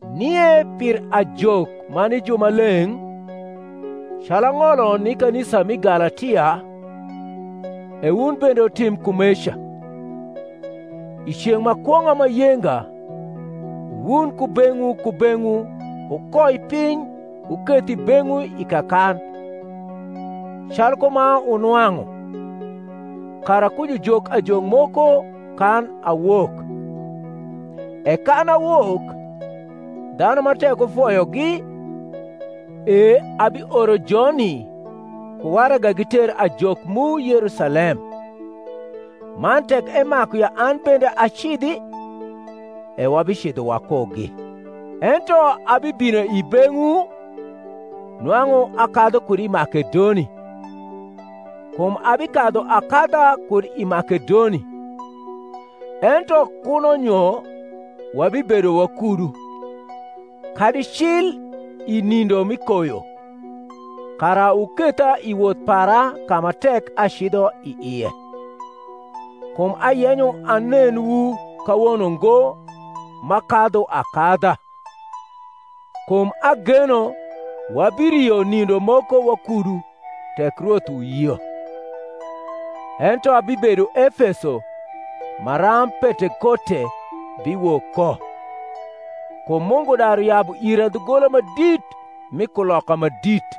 Nie pir ajok ma ni jumaleng’, calu ang’olo ni kanisa mi Galatia, e wun bende wutim kumeca. I ceng’ ma kwong’a ma yenga wun kubeng’wu kubeng’wu wukoi piny wuketh i beng’wu i kakan, calku ma wunwang’u, kara ku jujok ajok moko kan awok. E kan awok, dhanu ma tek wufoyogi, e abioro joni ku waraga giter ajok mu Yerusalem; man tek emaku ya an bende acidhi, e wabicidho wakugi. Ento abibino i beng’wu, nwang’u akadhu kud i Makedoni; kum abikadhu akadha kud i Makedoni; ento kuno nyo wabibedo wakudu, kadi cil i nindo mi koyo, kara wuketha i woth para ka ma tek acidho i ie. Kum ayenyo anenwu kawono ngo m’akadhu akadha; kum ageno wabirio nindo moko wakudu, tek Rwoth uyio. Ento abibedo Efeso maram Pentekote biwok ko; kum Mungu daru yabu ira dhugola ma dit mi kuloka ma dit,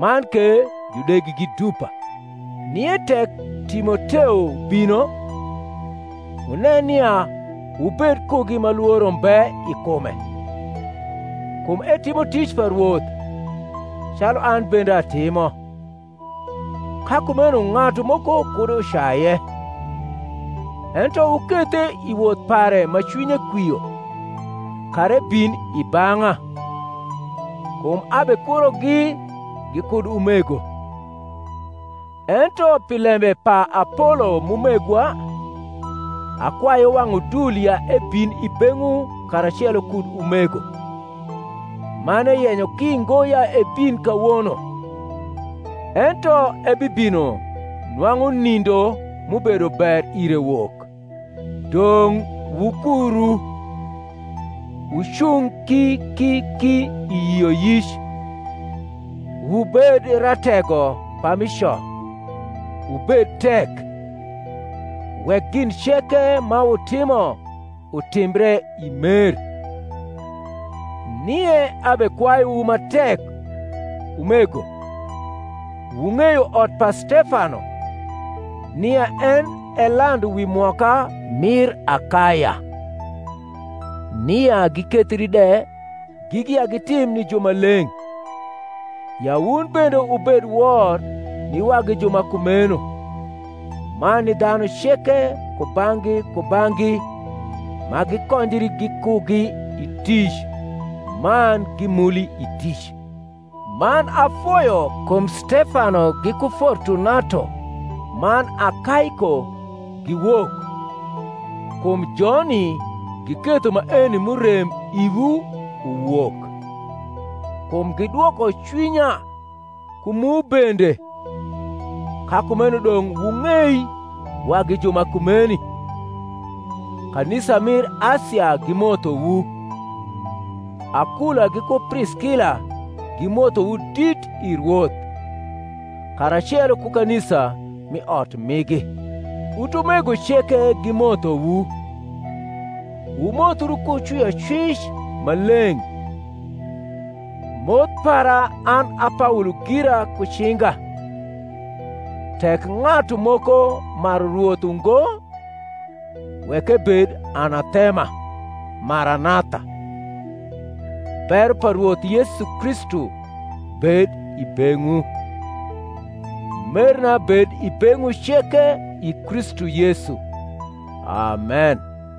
man ke judegi gi dupa. Nie tek Timoteo bino, wunen nia wubed kugi ma lworo mbe i kume; kum etimo tic pa Rwoth, calu an bende atimo: ka kumeno ng’atu moko kud ucaye. Ento wukethe i woth pare ma cwinye kwio, kara ebin i bang’a: kum abekurogi gikud umego. Ento pi lembe pa Apolo m’umegwa, akwaye wang’ udul ya ebin i beng’wu karacelo kud umego: man eyenyo ki ngo ya ebin kawono; ento ebibino nwang’u nindo m’ubedo ber ire wok. Dong’ wukuru, wucung ki ki ki i yioyic, wubed ratego pami co, wubed tek. Wek gin ceke ma wutimo utimbre i mer. Nie abekwayuwu ma tek, umego (wung’eyo ot pa Stefano, nia en e landu wi mwoka mir Akaya, nia gikethri de gigi ya gitim ni jumaleng’), ya wun bende wubed wor ni wagi ju ma kumeno, man ni dhanu ceke kubang’gi kubang’gi ma gikonjri gikugi i tic man gimuli i tic. Man afoyo kum Stefano giku Fortunato man Akaiko giwok: kum joni giketho maeni m’urem iwu uwok. Kum gidwoko cwinya ku mu bende: ka kumeno dong’ wung’ei wagi ju ma kumeni. Kanisa mir Asia gimothowu. Akula giku Priskila gimothowu dit i Rwoth, karacelo ku kanisa m’i ot migi. Utumego ceke gimothowu. Wumothru ku cwiocwic ma leng’. Moth para an a Paolo gira ku cinga. Tek ng’atu moko maru Rwoth ungo, wek ebed anathema. Maranatha. Bero pa Rwoth Yesu Kristu bed i beng’wu. Merna bed i beng’wu ceke i Kristu Yesu. Amen.